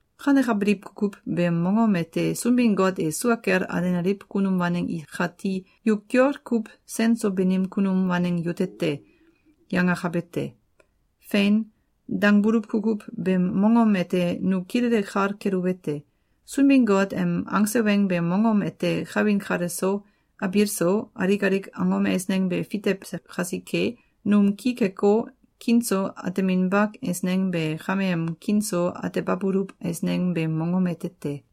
Kanekabiliw kukuw beem mongom ete Sunbin-Got e sua kel alenaliw kunum waneng ikati “Yu kiol kuw sen so banim kunum waneng yute te!”, yangakabe te. “Fein!”, dangbuluw kukuw beem mongom ete nu kilele kal keluwete: Sunbin-Got em angse weng beem mongom ete kawin kale so, abiil so, alik alik angom eisneng be fitewse kasike, num ki keko, kiin so ateminba eisneng be kameem kiin so atebabuluw eisneng beem mongom ete te.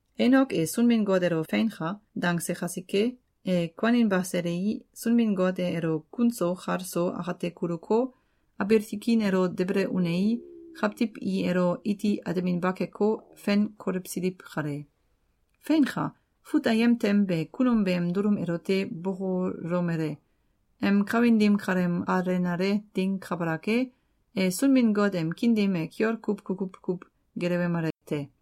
Enok e Sunbin-Got elo “Feinka!”, dangse kasike, e kuaninba selei, Sunbin-Got e elo kun so kal so akate kuluko, abiil tikin elo debele unei, kawtiw i elo iti ateminba keko, fen kolewsiliw kale. Feinka! Fut ayem tem be kunum beem dulum elote bokolomele: Em kawin dim kaleem alenale ding kabalak e, e Sunbin-Got em kiin dim e kiol kuw kukuw kuw gelewemale te.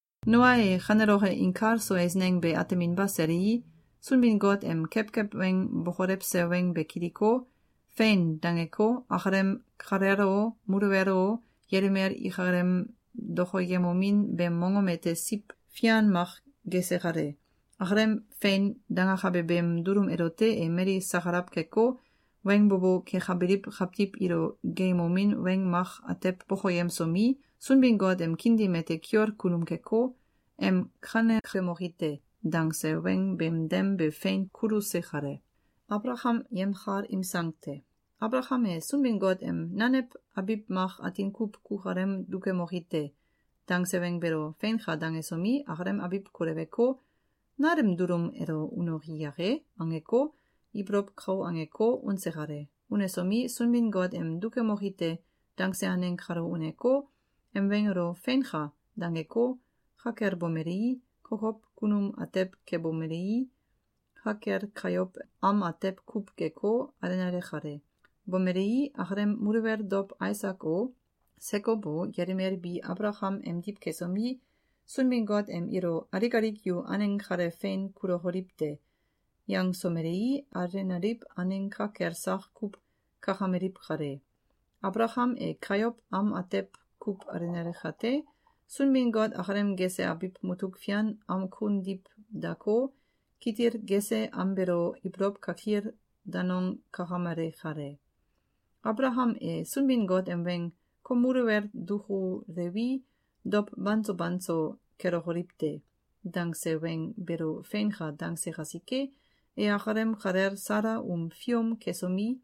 Noa e kaneloke inkal so eisneng be ateminba selei, Sunbin-Got em kewkew weng bokolewse weng be kiliko, “Fein!”, dangeko, akalem kalel o, muluwel o, yelimel ikalem dokoyemomin beem mongom ete siw fian mak gese kale. Akalem “Fein!”, dangakabe beem dulum elote e mali sakalaw keko, weng bo bo kekabiliw kawtiw ilo geeyemomin weng mak atew bokoyemsomi, Sunbin-Got em kiin dim ete kiol kunum keko, em “Kanekemoki te!”, dangse weng beem dem be fein kuluse kale. Abalakam e Sunbin-Got em “Nanew abiw mak atin kuw kukalem dukemoki te!”, dangse weng beelo “Feinka!”, dangesomi, akalem abiw koleweko, “Nal em dulum elo unoki yake?”, angeko, ibolow kau angeko, unse kale. Unesomi, Sunbin-Got em “Dukemoki te!”, dangse aneng kalo uneko, em weng elo “Feinka!”, dangeko, ka kel bomelei, kokow kunum atew kebomelei, ka kel kayow am atew kuw geko, alenale kale. Bomelei, akalem muluwel dow Aisak o, Sekow o, yelimel bi Abalakam emdiw kesomi, Sunbin-Got em ilo “Alik alik yu aneng kale fein kulokoliw te!”, yangsomelei, alenaliw aneng ka kel sak kuw kakameliw kale. Abalakam e kayow am atew kuw alenale kate, Sunbin-Got akalem gese abiw mutuk fian am kun diw dako, kitil gese am beelo ibolow kakil danong kakamale kale. Abalakam e Sunbin-Got em weng “Kom muluwel dukulewi, dow banso banso kelokoliw te!”, dangse weng beelo “Feinka!”, dangse kasike, e akalem kalel Sala um fium kesomi,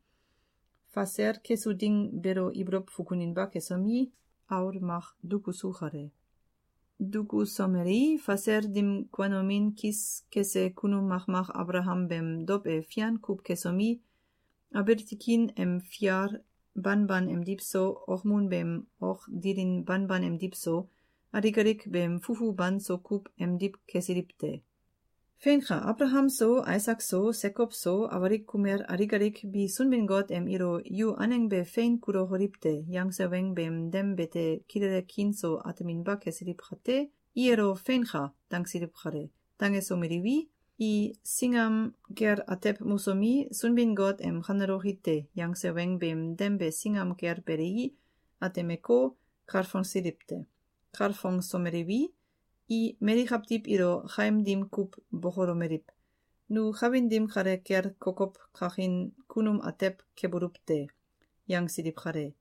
fasel kesu ding beelo ibolow fukuninba kesomi, aul mak dukuse kale. Dukusomelei, fasel dim kuanomin kis kese kunum makmak Abalakam beem dow e fian kuw kesomi, abiil tikin em fial banban emdiw so, okmun beem ok dilin banban emdiw so, alik alik beem fufu banso kuw emdiw kesiliw te. Feinka! Abalakam so, Aisak so, Sekow so, awalik kumel alik alik bi Sunbin-Got em ilo “Yu aneng be fein kulokoliw te!”, yangse weng beem dem bete kilele kiin so ateminba kesiliw kate, i elo “Feinka!”, dangsiliw kale. Dangesomeliwi, i singam kel atew mosomi, Sunbin-Got em “Kaneloki te!”, yangse weng beem dem be singam kel belei, atemeko, kalfongsiliw te. Kalfongsomeliwi, i mali kawtiw ilo kaim dim kuw bokolomeliw: “Nu kawin dim kale kel kokow kakin kunum atew kebuluw te!”, yangsiliw kale.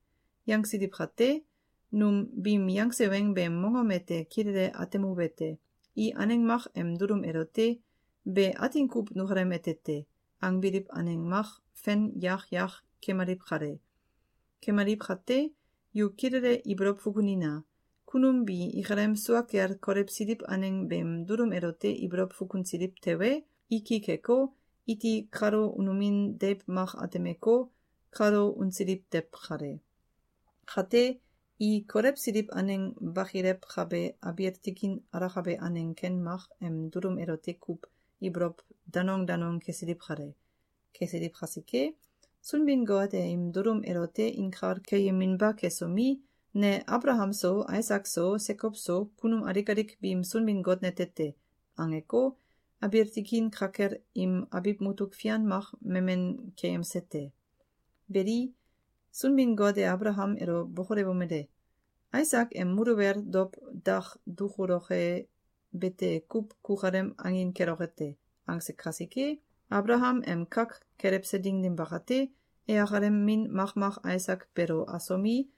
Yangsiliw kate, nu biim yangse weng beem mongom ete kilele atemuwete: I aneng mak em dulum elote “Be atin kuw nukalem ete te!”, angbiliw aneng mak fen yak yak kemaliw kale. Kemaliw kate, yu kilele ibolow fukunina! Kunum bi ikalem sua kel kolewsiliw aneng beem dulum elote ibolow fukunsiliw tewe, i ki keko, iti kalo unomin deiw mak atemeko, kalo unsiliw tew kale. Kate, i kolewsiliw aneng bakilewkabe abiil tikin alakabe aneng ken mak em dulum elote kuw ibolow danong danong kesiliw kale. Kesiliw kasike, Sunbin-Got e im dulum elote inkal keyeminba kesomi, “Ne Abalakam so, Aisak so, Sekow so, kunum alik alik biim Sunbin-Got nete te!”, angeko, abiil tikin ka kel im abiw mutuk fian mak memen keyemse te. Beli, Sunbin-Got e Abalakam elo bokolewomele: “Aisak em muluwel dow dak dukuloke bete kuw kukalem angin keloke te!”, angse kasike, Abalakam em kak kelewse ding dim bakate, e akalem min makmak Aisak beelo asomi,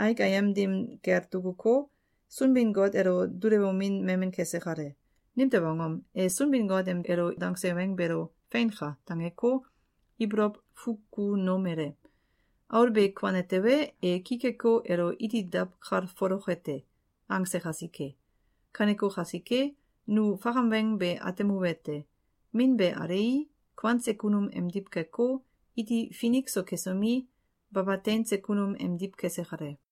aik ayem dim kel dukuko, Sunbin-Got elo dulewomin memen kese kale. Nimtew angom? E Sunbin-Got em elo dangse weng beelo “Feinka!”, dangeko, ibolow fukunomele: “Aul be kuane tewe, e ki keko, elo iti dawkalfoloke te!”, angse kasike. Kaneko kasike, nu fakam weng be atemuwete: Min be alei, kuanse kunum emdiw keko, iti finik so kesomi, baba teinse kunum emdiw kese kale.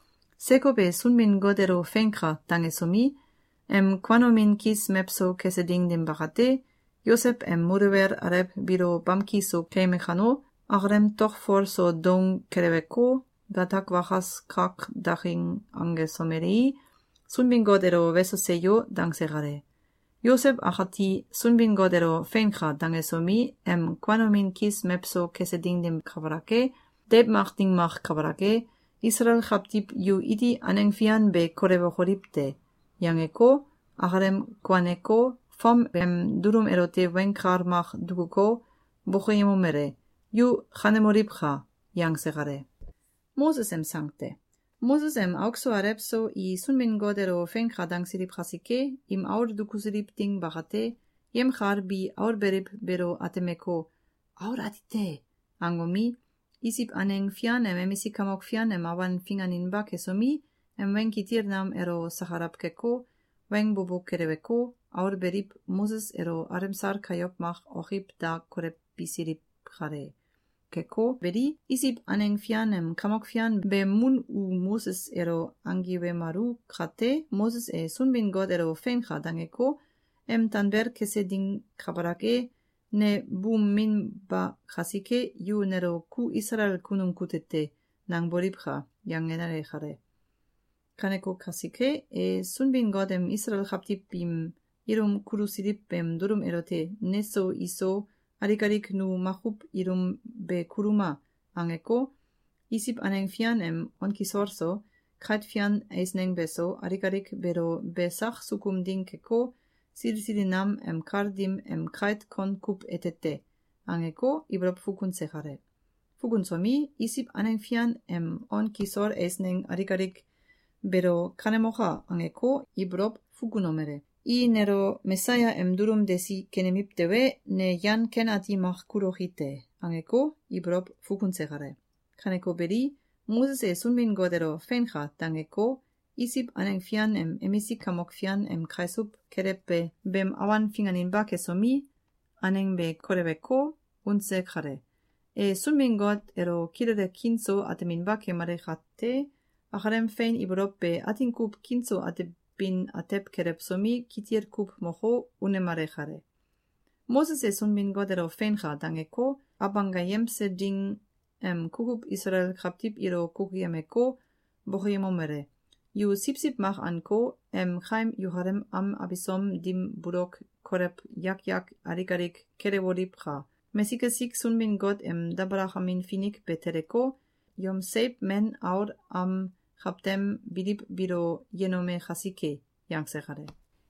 Sekow e Sunbin-Got elo “Feinka!”, dangesomi, em kuanomin kis mewso kese ding dim bakate, Yosew em muluwel alew biilo bamki so keyeme kano, akalem tokfol so doung keleweko, gatak wakas kak daking angesomelei, Sunbin-Got elo “Weso! Seyo!”, dangse kale. Yosew akati Sunbin-Got elo “Feinka!”, dangesomi, em kuanomin kis mewso kese ding dim kabalak e, “Deiw mak ding mak kabalak e, Isalael kawtiw yu iti aneng fian be kolewokoliw te!”, yangeko, akalem kuaneko, fom beem dulum elote weng kal mak dukuko, bokoyemomele: “Yu kanemoliwka!”, yangse kale. Moses em auk so alew so i Sunbin-Got elo “Feinka!”, dangsiliw kasike, im aul dukusiliw ding bakate, yemkal bi aul beliw beelo atemeko, “Aul ati te!”, angomi, Isiw aneng fian em emisik kamok fian em awan finganinba kesomi, em weng kitil nam elo sakalaw keko, weng bo bo keleweko, aul beliw Moses elo alemsal kayow mak okiw da kolewbisiliw kale. Keko beli, Isiw aneng fian em kamok fian beem mun u Moses elo anggiwemalu kate, Moses e Sunbin-Got elo “Feinka!”, dangeko, em tanbel kese ding kabalak e, “Ne buum min ba kasike, yu nelo ‘Ku Isalael kunum kute te!’, nangboliwka!”, yangenale kale. Kaneko kasike, e Sunbin-Got em Isalael kawtiw biim ilum kulusiliw beem dulum elote “Neso iso, alik alik nu makuw ilum be kuluma!”, angeko, Isiw aneng fian em on kisol so, kait fian eisneng beso, alik alik beelo “Be sak sukum ding keko, sili sili nam em kal dim em kait kon kuw ete te!”, angeko, ibolow fukunse kale. Fukunsomi, Isiw aneng fian em on kisol eisneng alik alik beelo “Kanemoka!”, angeko, ibolow fukunomele: “I nelo Mesaya em dulum desi kenemiw tewe, ne yan ken ati mak kuloki te!”, angeko, ibolow fukunse kale. Kaneko beli, Moses e Sunbin-Got elo “Feinka!”, dangeko, Isiw aneng fian em emisik kamok fian em kaisuw kelewbe beem awan finganinba kesomi, aneng be koleweko, unse kale. E Sunbin-Got elo kilele kiin so ateminba kemale kate, akalem fein ibolow be atin kuw kiin so atebin atew kelewsomi, kitil kuw moko, unemale kale. Moses e Sunbin-Got elo “Feinka!”, dangeko, Abanggayemse Ding em kukuw Isalael kawtiw ilo kukuyemeko, bokoyemomele: “Yu siwsiw mak anko, em kaim yukalem am abisom dim bulok kolew yak yak alik alik kelewoliwka! Mesik esik Sunbin-Got em dabalakamin finik be teleko, yom seiw men aul am kawtem biliw biilo yenome kasike!”, yangse kale.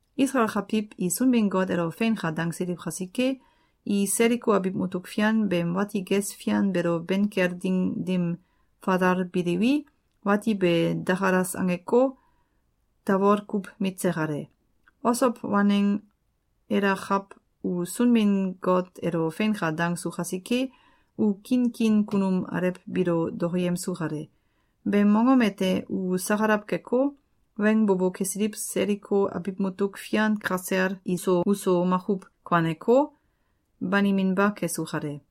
Isalael kawtiw i Sunbin-Got elo “Feinka!”, dangsiliw kasike, i Seliko abiw mutuk fian beem wati ges fian beelo ben kel ding dim falalbiliwi, wati be dakalas angeko, tawol kuw mitse kale. Osow waneng Elakaw u Sunbin-Got elo “Feinka!”, dangsu kasike, u kiin kiin kunum alew biilo dokoyemsu kale. Beem mongom ete u sakalaw keko, weng bo bo kesiliw Seliko abiw mutuk fian kasel iso uso makuw kuaneko, baniminba kesu kale.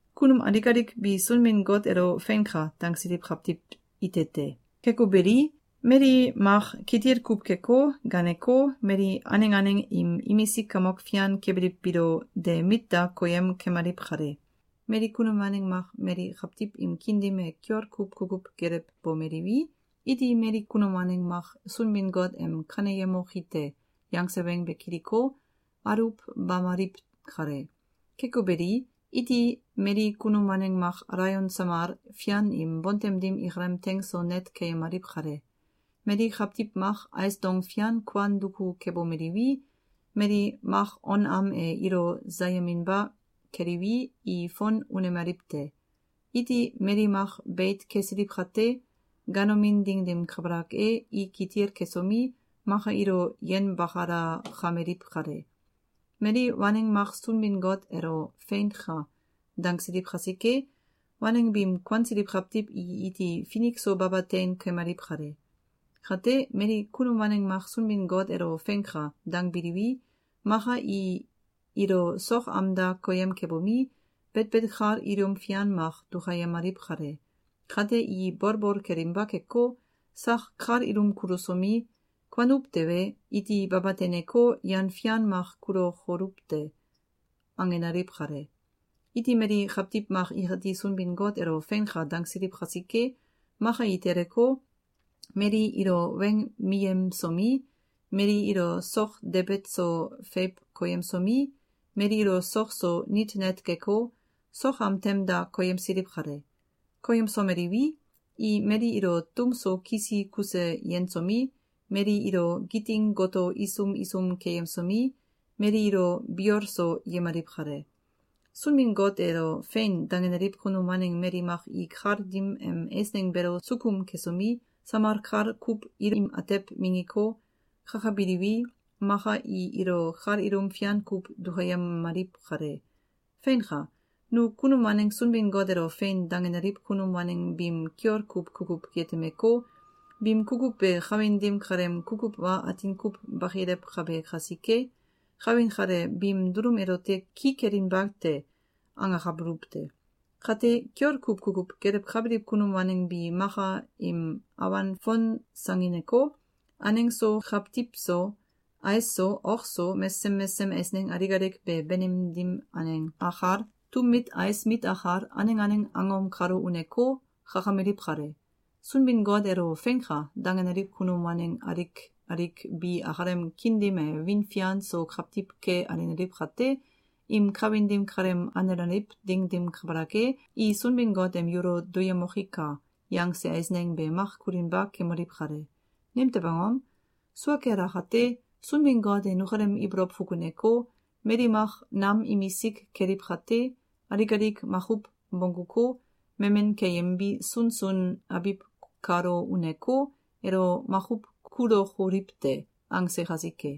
Kunum alik alik bi Sunbin-Got elo “Feinka!”, dangsiliw kawtiw ite te. Keko beli, mali mak kitil kuw keko, ganeko, mali aneng aneng im imisik kamok fian kebiliw biilo de mit da koyem kemaliw kale. Mali kunum waneng mak mali kawtiw im kiin dim e kiol kuw kukuw gelewbomeliwi, iti mali kunum waneng mak Sunbin-Got em “Kaneyemoki te!”, yangse weng be kiliko, aluwbamaliw kale. Keko beli, iti mali kunum waneng mak alaion samal fian im bontem dim ikalem teing so net keyemaliw kale. Mali kawtiw mak ais dong fian kuan duku kebomeliwi, mali mak on am e ilo sayeminba keliwi, i fon unemaliw te. Iti mali mak beit kesiliw kate, ganomin ding dim kabalak e, i kitil kesomi, maka ilo yenbakalakameliw kale. Mali waneng mak Sunbin-Got elo “Feinka!”, dangsiliw kasike, waneng biim kuansiliw kawtiw i iti finik so baba tein kemaliw kale. Kate, mali kunum waneng mak Sunbin-Got elo “Feinka!”, dangbiliwi, maka i ilo sok am da koyem kebomi, betbet kal ilum fian mak dukayemaliw kale. Kate, i bolbol kelinba keko, sak kal ilum kulusomi, “Kuanuw tewe, iti baba teineko, yan fian mak kululokoluw te!”, angenaliw kale. Iti mali kawtiw mak ikati Sunbin-Got elo “Feinka!”, dangsiliw kasike, maka i teleko, mali ilo weng miyemsomi, mali ilo sok debet so feiw koyemsomi, mali ilo sok so nit net geko, sok am tem da koyemsiliw kale. Koyemsomeliwi, i mali ilo tum so kisi kuse yensomi, mali ilo giting goto isum isum keyemsomi, mali ilo biol so yemaliw kale. Sunbin-Got elo “Fein!”, dangenaliw kunum waneng mali mak i kal dim em eisneng beelo sukum kesomi, samal kal kuw ilim atew minggiko, kakabiliwi, maka i ilo kal ilum fian kuw dukayemaliw kale. Feinka! Nu kunum waneng Sunbin-Got elo “Fein!”, dangenaliw kunum waneng biim kiol kuw kukuw yetemeko, “Biim kukuw be kawin dim kaleem kukuw wa atin kuw bakilewkabe kasike, kawin kale biim dulum elote ki kelinba te!”, angakabuluw te. Kate, kiol kuw kukuw gelewkabiliw kunum waneng bi maka im awan fonsangineko, aneng so, kawtiw so, ais so, ok so, mesesem mesesem eisneng alik alik be banim dim aneng akal, tum mit ais mit akal, aneng aneng angom kalo uneko, kakameliw kale. Sunbin-Got elo “Feinka!”, dangenaliw kunum waneng alik alik bi akalem kiin dim e wiin fian so kawtiw ke alenaliw kate, im kawin dim kaleem alenaliw ding dim kabalak e, i Sunbin-Got em “Yulo duyemokika!”, yangse eisneng be mak kulinba kemaliw kale. Nimtew angom? Sua kel akate, Sunbin-Got e nukalem ibolow fukuneko, “Mali mak nam imisik keliw kate, alik alik makuw bongguko, memen keyembi sunsun abiw kalo uneko, elo makuw kulokoliw te!”, angse kasike.